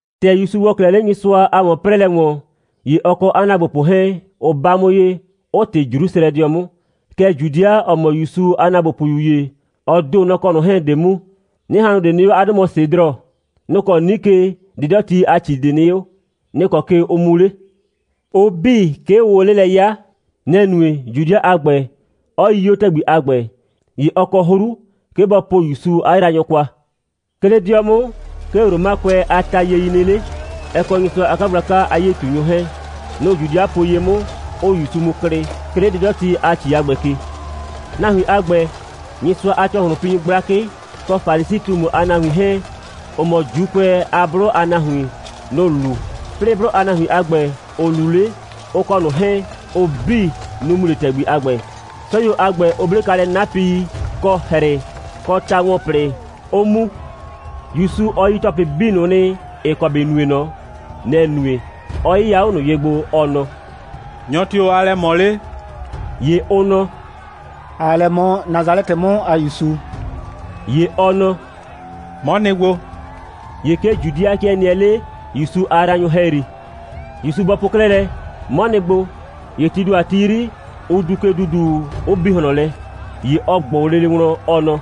‑Tɛ ‑Yusu ‑wɔ 'klɛɛ 'le Nyɩsʋa a ‑wɔn'prɛɛlɛ ‑wɔn, ‑ye ɔ kɔ 'a ‑naagbopʋ 'hɛɛn, ʋ 'ba 'mʋ ye, 'ʋ ꞊tɩ Jrusrɛdɩɔ 'mʋ. Kɛɛ, Judɩa, ‑ɔ mɔ ‑Yusu a ‑naagbopʋyu ‑ye, ɔ ‑do, nɔ‑ kɔ ꞊nʋ 'hɛɛn‑ 'de mu. 'Nɩhannʋ ꞊de nɩ 'o, 'a 'dʋ mɔ Sedrɔ. Nʋ‑ kɔ 'nike 'dɩdɔti a ‑ci ꞊de nɩ 'o. Nɛ‑ kɔ ke ʋ mu 'le. Ʋ 'bii, 'ke ʋʋ o 'le lɛ 'ya. Nɛ‑ nue, Judɩa a ‑gbɛ 'ɔ yii 'o ‑tɛgbi a ‑gbɛ, ‑ye ɔ kɔ 'hru, 'ke bɔ po ‑Yusu 'a yraanyʋ kwa. 'Ke 'le 'dɩɔ 'mʋ, 'ke Romakʋɛ a tayie nɩ 'le, ɛ kɔ Nyɩsʋa a 'kagblaka a 'yie꞊tunyʋ 'hɛɛn. Nʋ‑ Judɩa po ye 'mʋ, 'ʋʋ ‑Yusu mu klɩ, 'ke 'le 'dɩdɔti a ‑ci a ‑gbɛ ke. Nahuin a ‑gbɛ, Nyɩsʋa a ‑cɔhlʋnpinyʋ gblakɩ kɔ Falisi꞊tumu a nahuin 'hɛɛn, ‑ʋ mɔ ‑Juukʋɛ a 'blʋ a nahuin, nʋ‑ lu, 'plɩɩ 'blʋ a nahuin a ‑gbɛ, ‑ʋ luu 'le, ʋ kɔ ꞊nʋ 'hɛɛn, ʋ 'bii, nʋ‑ mu 'le ‑tɛgbi a ‑gbɛ. 'Sɔyuo a ‑gbɛ, ʋ 'ble kwa lɛ 'napɩi, kɔ ‑hrɩ kɔ ta‑wɔn‑tɔplɩ, 'ʋ mu. ‑Yusu, ɔ yi ‑tɔplɩ 'bii ꞊nʋ nɩ, ‑ɩ kɔ ‑bɩ nue ꞊nɔ. Nɛ‑ nue, 'ɔ 'yɩya 'o ꞊nʋ ye gbo, ɔ nɔ: «Nyɔ tio‑ aa lɛ ꞊mɔ 'le?» ‑Ye ʋ nɔ: «‑Aa lɛ ꞊mɔ Nasalɛtɩ 'mʋ a ‑Yusu.» ‑Ye ɔ nɔ: «'Mɔ nɩ gbo.» ‑Ye 'ke Judɩa 'kɩɛ nɩɛ 'le ‑Yusu a yraanyʋ ‑hɛyri. ‑Yusu bɔ po 'klɛɛ lɛ: «'Mɔ nɩ gbo,» ‑ye tii ‑do a ti 'yri, ʋ duu ke ‑duuduu, 'ʋ bi ꞊hlɔn lɛ. ‑Ye ɔ ꞊gbʋ lele wlɔn, ɔ nɔ: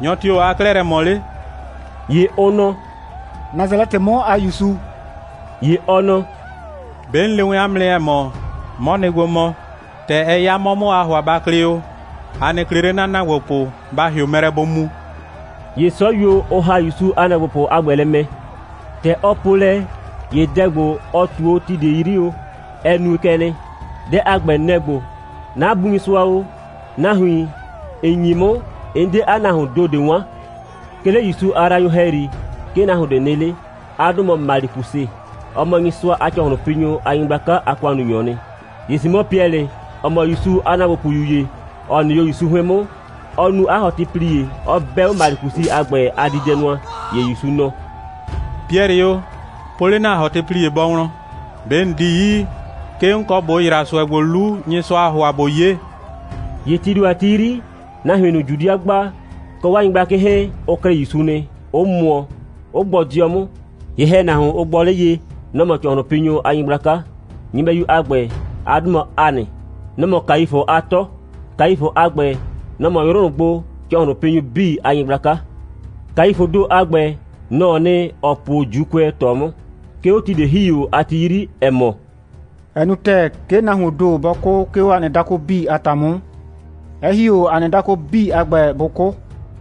«Nyɔ tio‑ aa 'klɛɛ lɛ ꞊mɔ 'le?» ‑Ye ʋ nɔ: «Nasalɛtɩ 'mʋ a ‑Yusu.» ‑Ye ɔ nɔ: «'Be 'n le wɛn 'a mʋ nɩ, ‑ɛ mɔ: 'Mɔ nɩ gbo mɔ. ‑Tɛ ɛ 'ya 'mɔ 'mʋ o, aa ‑hʋa ba klɩ o, a nɩ klɩ 'le 'na ‑naagbopʋ, ba ‑hɩʋ mɛ lɛ bʋ mu.» ‑Ye 'sɔyuo, ʋ ‑ha ‑Yusu a ‑naagbopʋ a ‑gbɛ lɛ mɛ. ‑Tɛ ɔ po lɛ, ‑ye dɛ ‑gbo, ɔ ꞊tu o ti ꞊de 'yri o, ɛ nue kɛ nɩ. Dɛ a ‑gbɛ, nɛ‑ ‑gbo: «'Na Bu Nyɩsʋa o, nahuin, ‑n nyi 'mʋ, 'n 'de 'a nahuoon ‑do ꞊de 'wan.» 'Ke 'le ‑Yusu a yraanyʋ ‑hɛyri, 'ke nahuon ꞊de nɩ 'le. 'A 'dʋ mɔ Malikusɩ. Ɔ mɔ Nyɩsʋa a ‑cɔhlʋnpinyʋ a nyɩgblaka a ‑kʋannunyɔɔ nɩ. ‑Ye Simɔ Piɛlɩ, ‑ɔ mɔ ‑Yusu a ‑naagbopʋyu ‑ye, ‑ɔ nɩ 'o ‑Yusu 'hʋɩn 'mʋ, ɔ nu 'a ‑hɔtɩplie, 'ɔ 'bɛ 'o Malikusɩ a ‑gbɛ a diidɛnʋa. ‑Ye ‑Yusu nɔ: «Piɛlɩ o, po 'le ‑na ‑hɔtɩplie bɔ wlɔn. ꞊Be ‑n 'di yi, 'ke 'n kɔ ꞊bo ‑yra ꞊sʋɛ ‑gbo 'lu, Nyɩsʋaa ‑hʋa, ꞊bo 'ye?» ‑Ye tii ‑do a ti 'yri, nahuin ꞊nʋ, Judɩa gba, kɔ 'waa nyɩgblakɩ 'hɛɛn, ʋ klɩ ‑Yusu nɩ, 'ʋ mʋɔ, 'ʋ gbɔ 'dɩɔ 'mʋ. Ye‑hɛnahuon, ʋ gbɔ 'le ye, nɔ‑ mɔ ‑cɔhlʋnpinyʋ a nyɩgblaka. Nyɩbɛyu a ‑gbɛ, 'a 'dʋ mɔ Hanɩ. Nɔ‑ mɔ Kaifʋ a 'tɔ. Kaifʋ a ‑gbɛ, nɔ‑ mɔ 'yrʋ ꞊nʋ gbo ‑cɔhlʋnpinyʋ 'bii a nyɩgblaka. Kaifʋʋ ‑do a ‑gbɛ, nɔ‑ɔ nɩ, ‑ɔ po o ‑Juukʋɛ ꞊tɔ 'mʋ, 'ke 'o ti ꞊de ‑hi o a ti 'yri, ‑ɛ mɔ: «Ɛ nu ‑tɛɛ, 'ke nahuoon ‑do bɔ 'kʋ, 'ke 'o ‑a nɩ dakʋ 'bii a ‑ta 'mʋ, 'ɛ ‑hi 'o ‑a nɩ dakʋ 'bii a ‑gbɛ, bʋ 'kʋ.»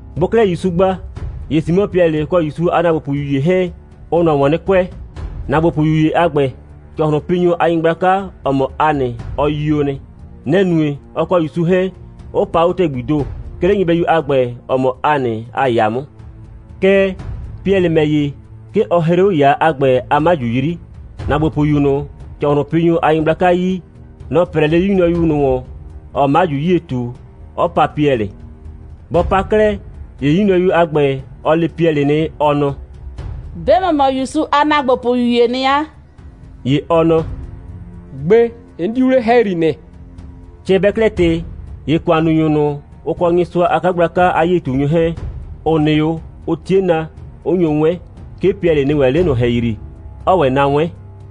Bʋʋ 'klɛɛ ‑Yusu gba, ‑ye Simɔ Piɛlɩ kɔ ‑Yusu a ‑naagbopʋyu ‑ye 'hɛɛn, ʋʋ ꞊nɔ ‑wɔn 'nɩ kʋɛ. ‑Naagbopʋyu ‑ye a ‑gbɛ, ‑cɔhlʋnpinyʋ a nyɩgblaka, ‑ɔ mɔ Hanɩ, ɔ yio nɩ. Nɛ‑ nue, ɔ kɔ ‑Yusu 'hɛɛn 'ʋ pa 'o ‑tɛgbii ‑do, 'ke 'le nyɩbɛyu a ‑gbɛ, ‑ɔ mɔ Hanɩ a ‑yaa 'mʋ. Kɛɛ, Piɛlɩ ‑mɛ ‑ye, 'ke ɔ hree 'o ‑yaa a ‑gbɛ a 'maju 'yri. ‑Naagbopʋyu ꞊nʋ, ‑cɔhlʋnpinyʋ a nyɩgblaka yi, nɔ‑ 'prɛɛ 'le 'yu nyrɔyu ꞊nʋ ‑wɔn, ‑ɔɔ 'maju 'yie ꞊tu, 'ɔ paa Piɛlɩ. Bɔ pa 'klɛɛ, ‑ye 'yu nyrɔyu a ‑gbɛ, ɔ le Piɛlɩ nɩ, ɔ nɔ: «'Be ‑mɔ mɔ ‑wɛ ‑Yusu a ‑naagbopʋyu ‑yee nɩ 'a.» ‑Ye ɔ nɔ: «Gbe, 'n 'diu 'le ‑hɛyri nɩ.» Cɛ bɛɛ 'klɛɛ ꞊tɩ, ‑ye ‑kʋannunyʋ ꞊nʋ, ʋ kɔ Nyɩsʋa a 'kagblaka a 'yie꞊tunyʋ 'hɛɛn, ‑ʋ nɩ 'o, ʋ 'tie na, 'ʋ nyo 'wɛn. 'Ke Piɛlɩ nɩ ‑wɛ 'le ꞊nʋ ‑hɛyri, 'ɔɔ ‑wɛ na 'wɛn.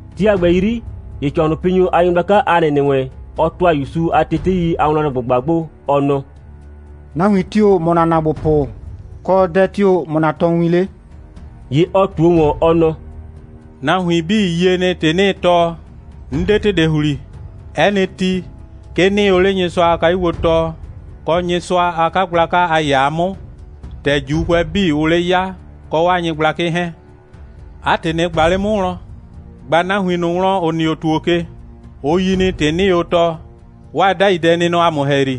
Ti a ‑gbɛ 'yri, ‑ye ‑cɔhlʋnpinyʋ a nyɩgblaka Hanɩ ‑nɩ wɛn, ɔ ‑tʋa ‑Yusu a tetei a wlɔnlɛ꞊gbʋgba gbo, ɔ nɔ: «Nahuin tio‑ mɔ ‑na ‑naagbopʋ, kɔ, dɛ tio‑ mɔ ‑na tɔɔwin 'le?» ‑Ye ɔ ꞊tuo ꞊wɔn, ɔ nɔ: «Nahuin 'bii yie nɩ, ‑tɩ 'nɩɩ tɔɔ. 'N 'de ‑tɩ ꞊de ‑hli. 'Ɛ nɩ ti, 'ke 'nɩɩ o 'le Nyɩsʋa a kayuo gbo tɔɔ, kɔ Nyɩsʋa a 'kagblaka a ‑yaa 'mʋ, ‑tɛ ‑Juukʋɛ 'bii, ʋʋ 'le 'ya, kɔ 'waa nyɩgblakɩ 'hɛɛn. 'A ‑tɩ, ꞊nɩ ꞊gba 'le 'mʋ wlɔn! ꞊Gba nahuin ꞊nʋ wlɔn, ‑ʋ nɩ o ‑tuo ke. Ʋ yi nɩ, ‑tɩ 'nɩɩ o tɔɔ. 'Waa 'dai dɛ nɩ nɔ ‑a mʋ ‑hɛyri.»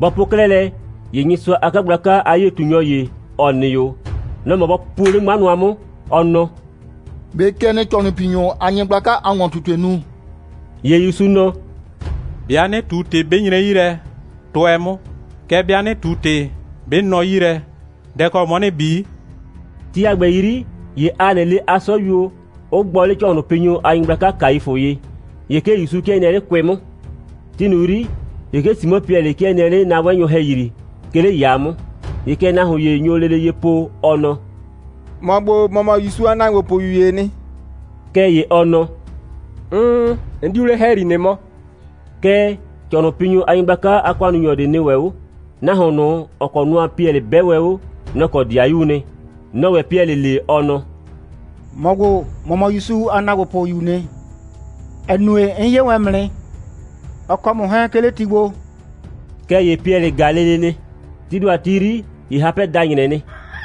Bɔ po 'klɛɛ lɛ, ‑ye Nyɩsʋa a 'kagblaka a 'yie꞊tunyɔ ‑ye, ‑ɔ nɩ 'o, nɔ‑ mɔ bɔ puo 'le 'ŋma nʋa 'mʋ, ɔ nɔ: «꞊Be kɛ ‑nɩɩ ‑cɔhlʋnpinyʋ a nyɩgblaka a ‑wɔn꞊tutue nu?» ‑Ye ‑Yusu nɔ: «'Bɩa 'nɩ ꞊tu ‑tɩ, 'bɩ nyre 'yi lɛ, tʋɛ 'mʋ, kɛɛ, 'bɩa 'nɩ ꞊tu ‑tɩ, 'bɩ nɔ 'yi lɛ, dɛ‑ kɔ 'mɔ ‑nɩɩ bi?» Ti a ‑gbɛ 'yri, ‑ye Hanɩ le 'a 'sɔyuo, 'ʋ gbɔ 'le ‑cɔhlʋnpinyʋ a nyɩgblaka Kaifʋ ye. ‑Ye 'ke ‑Yusu 'kɩɛ nɩɛ 'le 'kʋɩ 'mʋ. Ti ꞊nʋ 'yri, ‑ye 'ke Simɔ Piɛlɩ 'kɩɛ nɩɛ 'le na'wɛnnyʋ ‑hɛyri, 'ke 'le ‑yaa 'mʋ. ‑Ye kɛ nahuon ‑ye nyo lele ye po, ɔ nɔ: «‑Mɔ ‑gbo, ‑mɔ mɔ ‑Yusu a ‑naagbopʋyu ‑yee nɩ.» Kɛɛ, ‑ye ɔ nɔ: «'Mm, 'n 'diu 'le ‑hɛyri nɩ mɔ.» Kɛɛ, ‑cɔhlʋnpinyʋ a nyɩgblaka a ‑kʋannunyɔ ꞊de nɩ ‑wɛ 'o. Nahuon ꞊nʋ, ‑ɔ kɔ nʋa Piɛlɩ 'bɛ wɛn 'o, nɔ‑ kɔ 'dɩayuu nɩ. Nɔ‑ɔ ‑wɛ Piɛlɩ le, ɔ nɔ: «‑Mɔ ‑gbo, ‑mɔ mɔ ‑Yusu a ‑naagbopʋyuu nɩ, ‑ɛ nue, 'n 'ye wɛn ‑mʋ nɩ, ɔ kɔ ‑mʋ 'hɛɛn, 'ke 'le ti gbo.» Kɛɛ ‑ye Piɛlɩ ‑ga lele nɩ. Tii ‑do a ti 'yri, ‑ye hapɛ da ‑nyrɛ nɩ.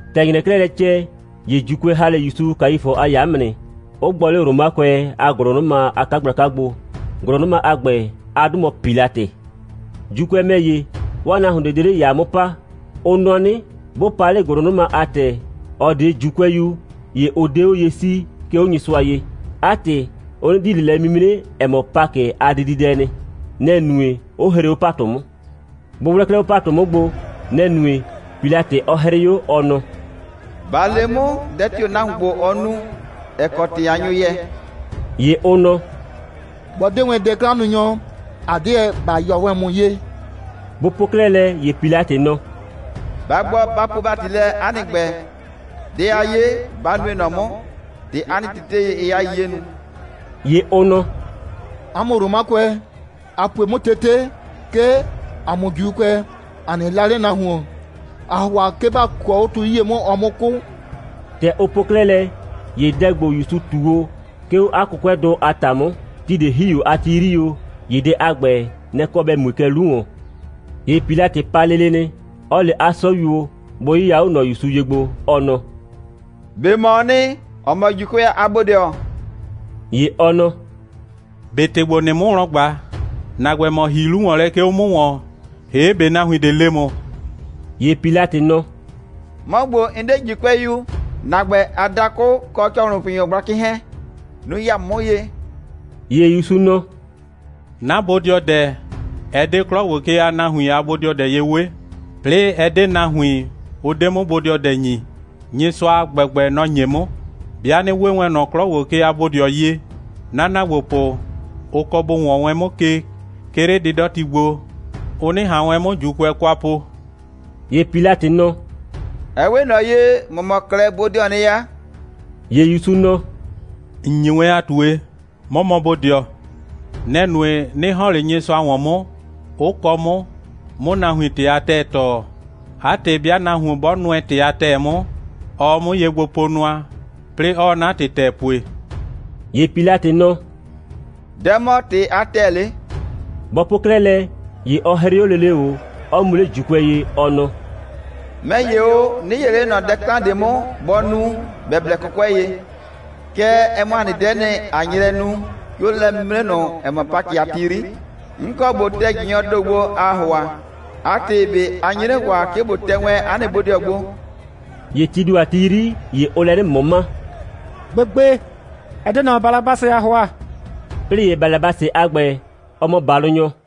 ‑Tɛ ‑nyrɛɛ 'klɛɛ lɛ cɛ, ‑ye ‑Juukʋɛ ‑ha 'le ‑Yusu Kaifʋ a ‑yaa 'mʋ nɩ, 'ʋ gbɔ 'le Romakʋɛ a ‑gʋlʋnʋma a 'kagblaka gbo. ‑Gʋlʋnʋma a ‑gbɛ, 'a 'dʋ mɔ Pilatɩ. ‑Juukʋɛ ‑mɛ ‑ye, 'waa nahuon ꞊de 'de 'le ‑yaa 'mʋ pa. Ʋ nɔ 'nɩ, 'bʋ pa 'le ‑gʋlʋnʋma a ‑tɛ, ‑ɔ 'de ‑Juukʋɛyu, ‑ye ʋ 'de 'o ye 'sii, 'ke 'o Nyɩsʋa ye. 'A ‑tɩ, ʋ 'nɩ di ꞊le lɛ'mimre, ‑ɛ mɔ Pakɩ a dididɛ nɩ. Nɛ‑ nue, 'ʋ hree 'o ‑patʋ 'mʋ. Bʋ 'wlɛ 'klɛɛ 'o ‑patʋ 'mʋ gbo, nɛ‑ nue, Pilatɩ 'ɔ 'hrɩ 'o, ɔ nɔ: «Ba le 'mʋ, dɛ tio‑ nahuon ‑gbo, ɔ nu, ‑ɛ kɔ ‑tɩ a nyo yɛɛ.» ‑Ye ʋ nɔ: «'Bɔ 'de wɛn dɛ'klannunyɔ, ‑a 'deɛ ‑ba yɔ wɛn ‑mʋ ye.» Bʋ po 'klɛɛ lɛ, ‑ye Pilatɩ nɔ: «Ba gbɔ, ba puo ‑bati lɛ 'a nɩ ‑gbɛ. Dɛ a 'ye, ba nue ꞊nɔ 'mʋ, ‑tɛ 'a nɩ tetei, ɩɩ 'a 'yiye nu!» ‑Ye ʋ nɔ: «'A mʋ Romakʋɛ, a pue 'mʋ tete, 'ke ‑a mʋ ‑Juukʋɛ ‑a nɩ 'la 'le nahuon. ‑Aa ‑hʋa 'ke ba kʋɔ 'o tu 'yie 'mʋ, ɔ 'mʋ 'kʋ.» ‑Tɛ ʋ po 'klɛɛ lɛ, ‑ye dɛ ‑gbo, ‑Yusu ꞊tu o, 'ke 'o 'a 'kʋkʋɛdʋ a ‑ta 'mʋ, ti ꞊de ‑hi o a ti 'yri o, ‑ye dɛ a ‑gbɛ, nɛ‑ kɔ ‑bɛ mue kɛ 'lu ‑wɔn. ‑Ye Pilatɩ pa lele nɩ, 'ɔ le 'a 'sɔyuo, bʋ 'yɩya 'o ꞊nɔ ‑Yusu ye gbo, ɔ nɔ: «꞊Be ‑mɔɔ nɩ, ‑ɔ mɔ ‑Juukʋɛ a bodɩɔ?» ‑Ye ɔ nɔ: «꞊Be ‑tɩ ‑gbo, ‑nɩɩ 'mʋ wlɔn ꞊gba, ‑na ‑gbɛ, ‑mɔ ‑hii 'lu ‑wɔn lɛ, 'ke 'o 'mʋ ‑wɔn, ‑hee' ꞊be nahuin ꞊de le ‑mʋ?» ‑Ye Pilatɩ nɔ: «'Mɔ ‑gbo, 'n 'de ‑Juukʋɛyu. ‑Na ‑gbɛ a dakʋ kɔ ‑cɔhlʋnpinyʋ gblakɩ 'hɛɛn, nʋ‑ ya ‑mʋ 'mʋ ye.» ‑Ye ‑Yusu nɔ: «'Na bodɩɔdɛ, ɛ 'de 'klɔ ‑gbo ke a nahuin a bodɩɔdɛ ye 'we, 'plɩɩ ɛ 'de nahuin, ʋ 'de 'mʋ bodɩɔdɛ ‑nyi, Nyɩsʋa a ‑gbɛgbɛ, nɔ‑ ‑nye 'mʋ. 'Bɩa 'nɩ 'we wɛn ꞊nɔ 'klɔ ‑gbo ke a bodɩɔ ye, 'na ‑naagbopʋ, ʋ kɔ bʋ ‑wɔn wɛn 'mʋ ke, 'ke 'le 'dɩdɔti gbo, ʋ 'nɩ ꞊han wɛn 'mʋ ‑Juukʋɛ kwa po.» ‑Ye Pilatɩ nɔ: «Ɛ 'we ꞊nɔ ye, ‑mɔ mɔ 'klɛɛ bodɩɔɔ nɩ 'a.» ‑Ye ‑Yusu nɔ: «‑N nyi wɛn a ꞊tue, 'mɔ mɔ bodɩɔ. Nɛ‑ nue, 'nɩ ‑hɔn 'le Nyɩsʋa ‑wɔn 'mʋ, 'ʋ kɔ 'mʋ, 'mʋ nahuin ‑tɩ a ‑tɛɛ tɔɔ. 'A ‑tɩ, 'bɩa nahuon 'bɔ nʋɛ ‑tɩ a ‑tɛɛ 'mʋ, ɔɔ 'mʋ ye gbo po nʋa, 'plɩɩ 'ɔɔ 'na ‑tɩ ‑tɛɛ pue.» ‑Ye Pilatɩ nɔ: «Dɛ‑ mɔ ‑tɩ a ‑tɛɛ 'le?» Bɔ po 'klɛɛ lɛ, ‑ye ɔ 'hrɩ 'o lele ꞊o, 'ɔ mu 'le ‑Juukʋɛ ye, ɔ nɔ: «'Mɛ ‑ye o, 'nɩ 'yee ꞊le 'le ꞊nɔ dɛ 'klan ꞊de 'mʋ, bɔ nu, ‑bɛ blɛ 'kʋkʋɛ ye. Kɛɛ, ɛ mɔ ‑a nɩ dɛ'ɛ nɩ, ꞊a nye lɛ nu, 'ke 'o lɛ'mimre ꞊nʋ, ‑ɛ mɔ Pakɩ a ti 'yri, 'n kɔ ꞊bo tɛ ꞊jɩnyɔɔ ‑do gbo, aa ‑hʋa. 'A ‑tɩ, ꞊be a nye 'nɩ ‑hʋa, 'ke ꞊bo tɛ wɛn 'a nɩ bodɩɔ gbo?» ‑Ye tii ‑do a ti 'yri, ‑ye ʋʋ lɛ 'nɩ ꞊mʋma: «Gbegbe, ɛ 'de ꞊nɔ, Balabasɩ ‑aa ‑hʋa.» 'Plɩɩ ‑ye Balabasɩ a ‑gbɛ, ɔ mɔ ‑balʋnyɔ.